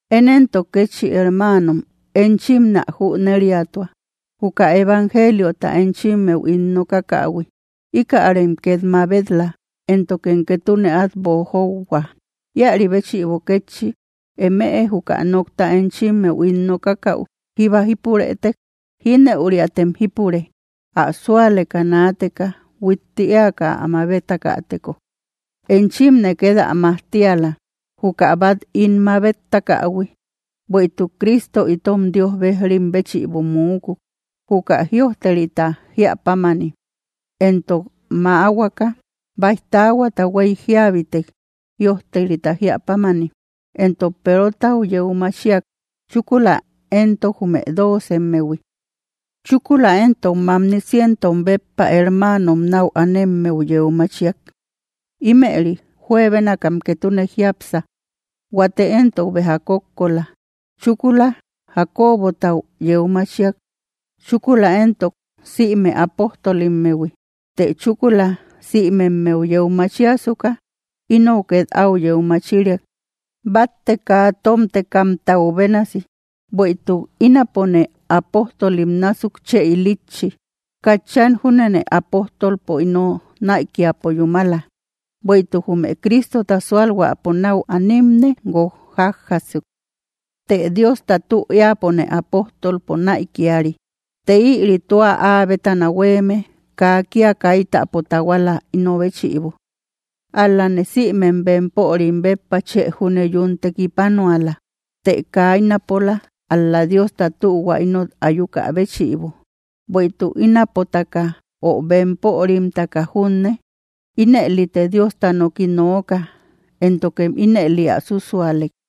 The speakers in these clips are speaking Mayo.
Én entok kétchi hermanom enchim nä jüneriatua, juka evangeliota enchimmeu ín nokakähui, ikärem ket mabet‑la, éntokem ketune at boojouhua. Iari béchïbo kétchi emëe juka nokta enchimmeu ín nokakau jíba jípurëtek, jineüriatem jípure, ä sualeka naateka huitti eaka ä mabetakäteko. Enchimne ket ä majtiala, juka bat im mabetakähui: Bueïtuk Crísto itom Dios bejrim béchïbo múkuk, juka jïojterita jiapámani. Entok mäahuaka, baij taahuata huey jíabitek, jïojterita jiapámani. Entok Perotau yeu machiak, chúkula entok jume doocemmehui. Chúkula entok mamni cientom béppa hermanom nau anemmeu yeu machiak, imeri juebénakam ketune jiápsa, huate entok béja kókko la. Chúkula Jacobotau yeu machiak; chúkula entok sïme apóstolimmehui. Të chúkula sïmemeu yeu machiasuka, inou ket au yeu machiriak, batte kaa tomtekämtau bénasi. Bueïtuk ínapone apojtolim násuk chë ilitchi, katchan júnene apojtolpo ino naïkiapo yúmala, bueïtuk jume Cristota sualhuäpo nau animne gúok jajasuk. Të Diosta tü eäpone apóstolpo naïkiari, të ïri tua áa bétana hueme kaa kia kaitäpo tahuala ino béchïbo, ál-lane sïmem bempörim béppa chë júne yún tekipanuala, të kaa inapola, ál‑la Diosta tühua inot ayukä béchïbo. Bueïtuk ínapotaka ö bemporimtaka junne, ínëlite Diosta noki nooka, éntokem ínëli ä susualek.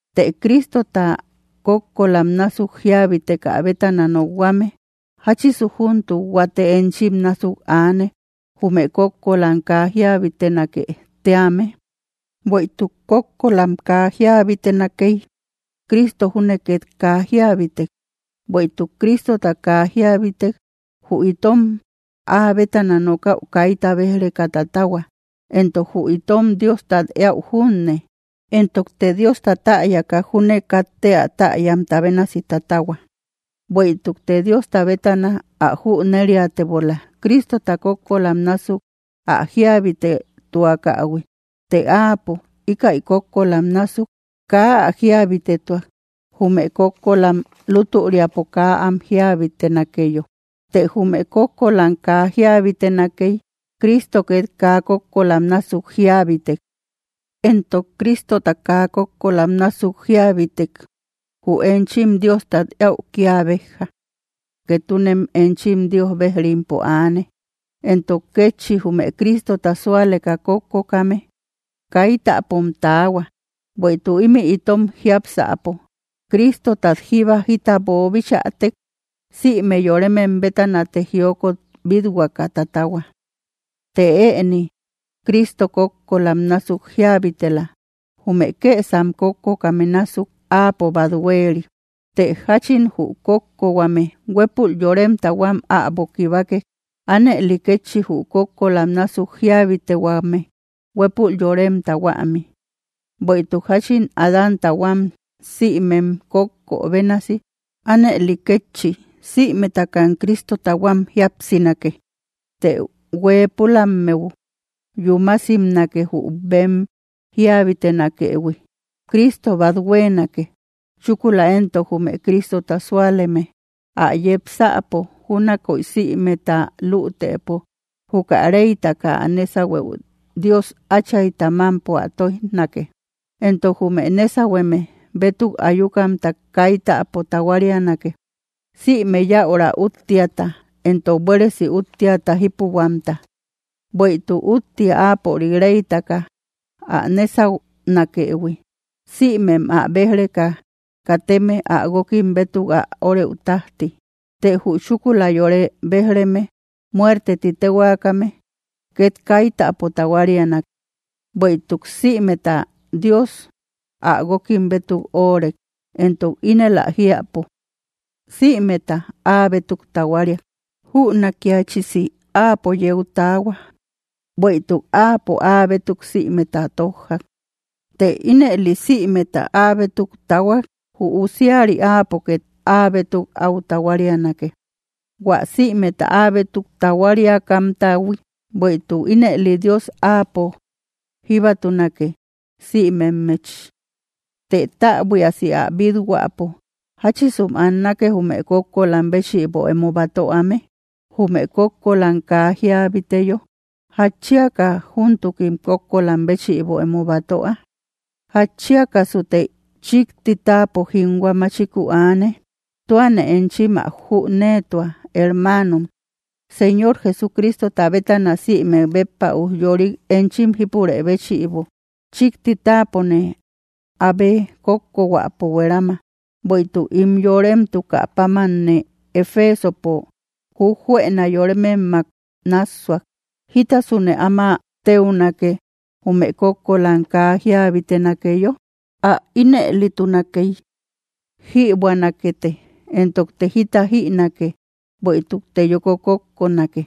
Të Cristota kókkolam násuk jiabiteka bétana nokhuame, ¿jachisu júntuk huate enchim násuk aane, jume kókkolam kaa jiabitenake tíame? Bueïtuk kókkolam kaa jiabitenakey, Crísto júne ket kaa jiabitek. Bueïtuk Crístota kaa jiabitek, jü itom áa bétana nokaü kayta bej‑reka tatahua entok jü itom Diostat eäu junne. Entokte Diosta täyaka júne katte ä täyamta bénasi tatahua, bueïtukte Diosta bétana ä jüneriatebola Cristota kókkolam nasuk ä jiabitetuakähui, të áapo, íkäi kókkolam nasuk kaa ä jiabitetuak, Jume kókkolam lutüriapo kaa am jiabitenakeyo. Të jume kókkolam kaa jiabitenakey, Cristo ket kaa kókkolam nasuk jiabitek. Entok Cristota kaa kókkolam nasuk jiabitek, jü enchim Diostat eäu kia bejja; ketunem enchim Dios bejrimpo aane, entok kétchi jume Cristota sualeka kókkokame, kaitäpom taahua. Bueïtuk imï itom jiápsäpo, Cristotat jíba jita boobichätek, sïme yoremem bétanate jiokot bit-huaka taatahua. Të ëni Cristo kókkolam násuk jiabitela; jume kësam kókkokame násuk, áapo bat hueri. Të jachin jü kókkohuame huepul yoremta huam äbo kibakek, anëli kétchi jü kókkolam násuk jiabitehuame, huepul yoremta huami. Bueïtuk jachin Adánta huam sïmem kókkö bénasi, anëli kétchi sïmetakam Cristota huam jíapsinake. Të hueepulammeu yúmasimnake jü bem jiabitenakëhui: Cristo bat huenake, chúkula entok jume Cristota súaleme, ä yepsäpo. Júnakoy sïmeta lütepo; juka reytaka ä nésahueu Dios áchayta mampo ä toijnake, entok jume nesahueme bétuk ayukamta kaitäpo tahuarianake, sïme yäura úttiata, entok buéresi úttiaka jipuhuamta. Bueïtuk úttia áapörik reytaka ä nésaunakëhui, sïmem ä bej‑reka kateme ä gúokim bétuk ä oreü tajti. Të jü chúkula yore bejreme, muerte tï tehuakame ket kaitäpo tahuariana. Bueïtuk sïmeta Dios ä gúokim bétuk órek, entok ínel ä jiäpo: sïmeta ä bétuk tahuariak, jünakiachisi áapo yeu taahua, bueïtuk áapo ä bétuk sïmeta tojjak. Të ínëli sïmeta aabétuk tahuak, jü usiari áapo ket áabétuk au tahuarianake, hua sïmeta aabétuk tahuariakamtahui, bueïtuk ínëli Dios áapo jíbatunake, sïmemmechi. Të täbuiasi ä bithuäpo, ¿jachisum annake jume kókkolam béchïbo emo batöame, jume kókkolam kaa jiabiteyo? ¿Jachiaka juntukim kókkolam béchïbo emo batoä? ¿Jatchiakasute chikti táapo jinhua machiku aane? Tüane enchim ä júnëtua hermanom, Señor Jesucristota bétana sïmek béppa ujyorik enchim jipurë béchïbo, chikti taapone abe kókko huäpo huerama. Bueïtuk ín yoremtukä pamamne Efesopo jujjuena yorememmak nassuak, ¿jítasune áma teunake, jume kókkolam kaa jiabitenakeyo? Ä inëlitunakey: “Jïbuänakete entokte jita jïnake, bueïtukte yoko kókkonake.”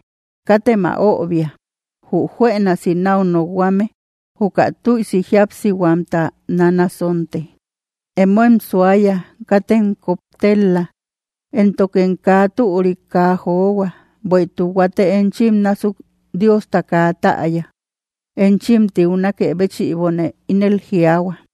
Katem ä öbia; jü juenasi nau nokhuame: “Juka tüisi jíapsibahuamta nanasonte.” Emóem suaya katem koptel‑la, éntokem kaa türik kaa johua; bueïtuk huate enchim násuk Diosta kaa täyáa, enchim tiunakë béchïbone ínel jiaahua.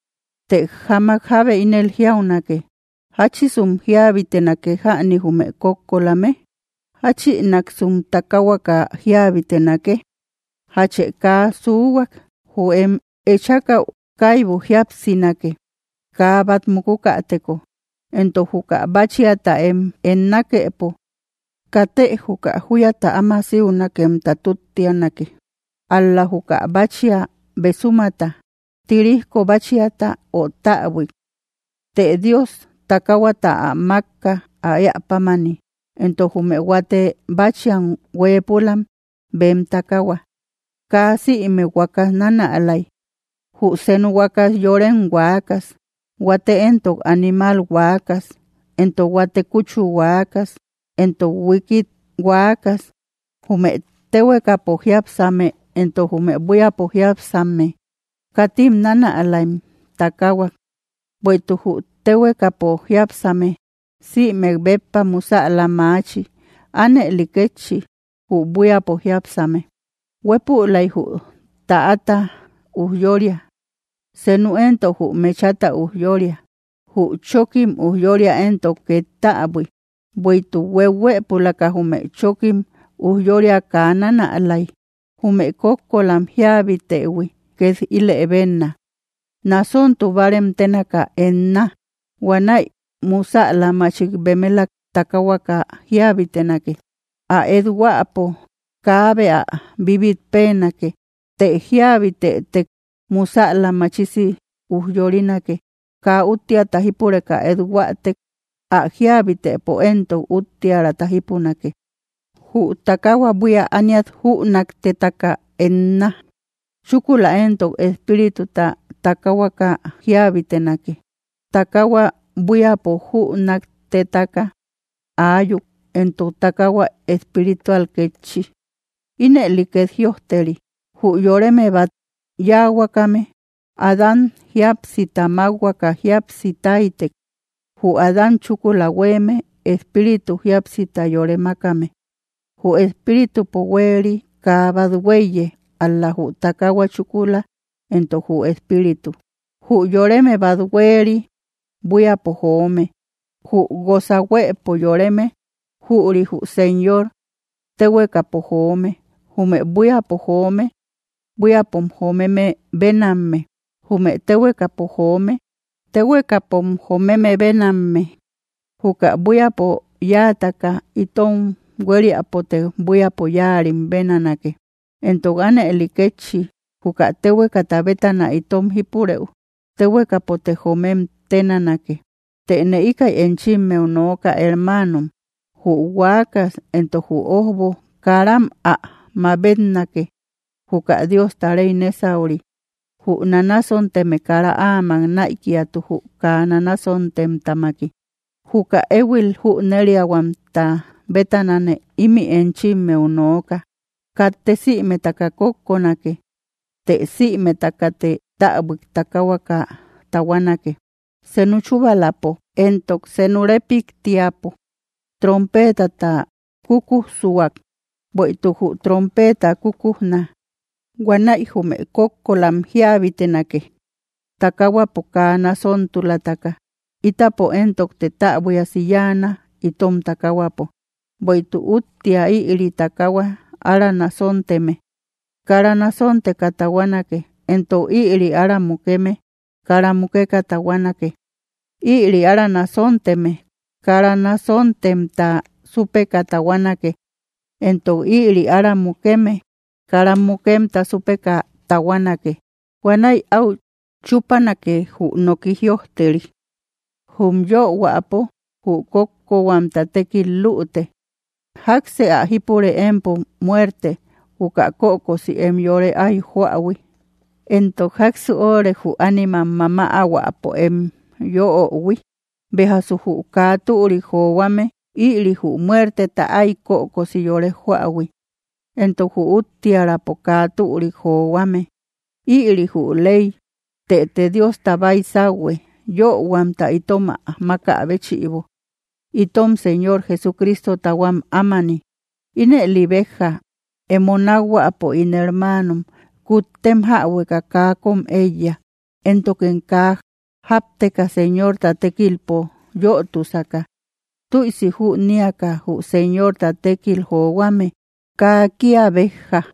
Të jáamak jábe ínel jiaunake: “¿Jachísum jiabitenake jäni jume kókkolame? ¿Jachïnaksum takahuaka jiabitenake?” Jachë kaa suhuak, jü em echakau kaybu jíapsinake, kaa bat mukukateko. Entok juka báchiata em ennakepo katë juka juyata áma siunakemta túttianake, ál‑la juka báchia besumata, tirijko báchiata ö täbuik. Të Dios takahuata ä makka ä ëa pámani, entok jume huate báchiam huëpulam bem takahua. Kaa sïme huakas nanälay, jü senu huakas yorem huakas, huate entok animal huakas, entok huate kuchu huakas, entok huíkit huakas. Jume téhuekapo jiápsame entok jume buíapo jiápsame, katim nanalaïm takahuak; bueïtuk jü téhuekapo jiápsame sïmek béppa musäla maachi, anëli kétchi jü buíapo jiápsame. Huepülay jü täata ujyória, senu entok jü mechata ujyória, jü chokim ujyória entok ket täbui, bueïtuk hueuhuëpulaka jume chokkim ujyória kaa nanalaï. Jume kókkolam jiabitehui ket ilëbenna, nasontubarem tenaka etnaa, huanäi musäla machik bemelak takahuaka jiabitenake. Ä et-huäpo kaabe ä bibitpenake, të jiabitetek musäla machisi ujyorinake, kaa úttiata jípureka ethuatek, ä jiabitepo entok uttiärata jipunake. Jü takahua buia ániat jünaktetaka etnaa, chúkula entok espírituta takahuaka jiabitenake, takahua buíapo jünaktetaka ayuk, entok takahua espritual kétchi. Ínëli ket jïojteri: “Jü yoreme bat yáahuakame, Adán jíapsita makhuaka jíapsi taytek”; jü Adán chúkula hueme, espíritupo jíapsita yore makame. Jü espíritupo hueeri kaa bat huéiye, ál‑la jü takahua, chúkula entok jü espíritu. Jü yoreme bat hueeri buíapo joome, jü goza huëpo yoreme, jüri jü Señor, téhuekapo joome. Jume buíapo joome, buíapom joomeme benamme; jume téhuekapo joome, tehuekapom joomeme benamme. Juka buíapo yáataka itom hueriapote buíapo yáarim benanake, entok anëli kétchi juka tehueka bétana itom jipurëu, tehuekapote joomem ténanake. Tëne ikaï enchimmeu nooka hermanom: Jü huaakas entok jü ojbo karam ä mabetnake juka Diosta rey nesauri, jü nanasomtume kara áamak naïkiatu jü kaa nanasomtem tamaki. Juka éhuil jüneriahuamta bétanane imï enchimmeu nooka: katte sïmetaka kókkonake; të sïmetakete täbuik takahuaka tahuanake, Senu chubalapo, entok senu repiktiapo, trompetata kukujsuak, bueïtuk jü trompeta kukujna, huanäi jume kókkolam jiabitenake, takahuapo kaa nasontulataka, itapo entokte täbuiasi yáana itom takahuapo. Bueïtuk úttia ïri takahua ára nasontume, kara nosonteka tahuanake, entok ïri ára mukeme kara mukeka tahuanake. Ïri ára nasontume kara nasontemta supeka tahuanake, entok ïri ára mukeme kara mukemta supeka tahuanake, huanäi au chupanake jü nooki jiöjteri: “Jum yöhuapo jü kókkohuamta tekkil lüte. ¿Jaksë ä jípure empo muerte, juka kökosi em yore ái joähui? ¿Entok jaksu órek jü ánimam mamahuäpo em yöohui?” Bejasu jü kaa türik johuame ïri jü muerteta ay kökosi yore joähui, entok jü úttiärapo kaa türik johuame, ïri jü ley. Tëte Diosta baysauhue, yöhuamta itom ä maka béchïbo, itom Señor Jesucristota huam ámani. Ínëli bejja, emo nakhuapo ín hermanom, kuttem jäbueka kaa kom eiya, éntokem kaa japteka Señorta tekilpo yötusaka, tüisi jüniaka jü Señorta tekkil johuame kaa kia bejja.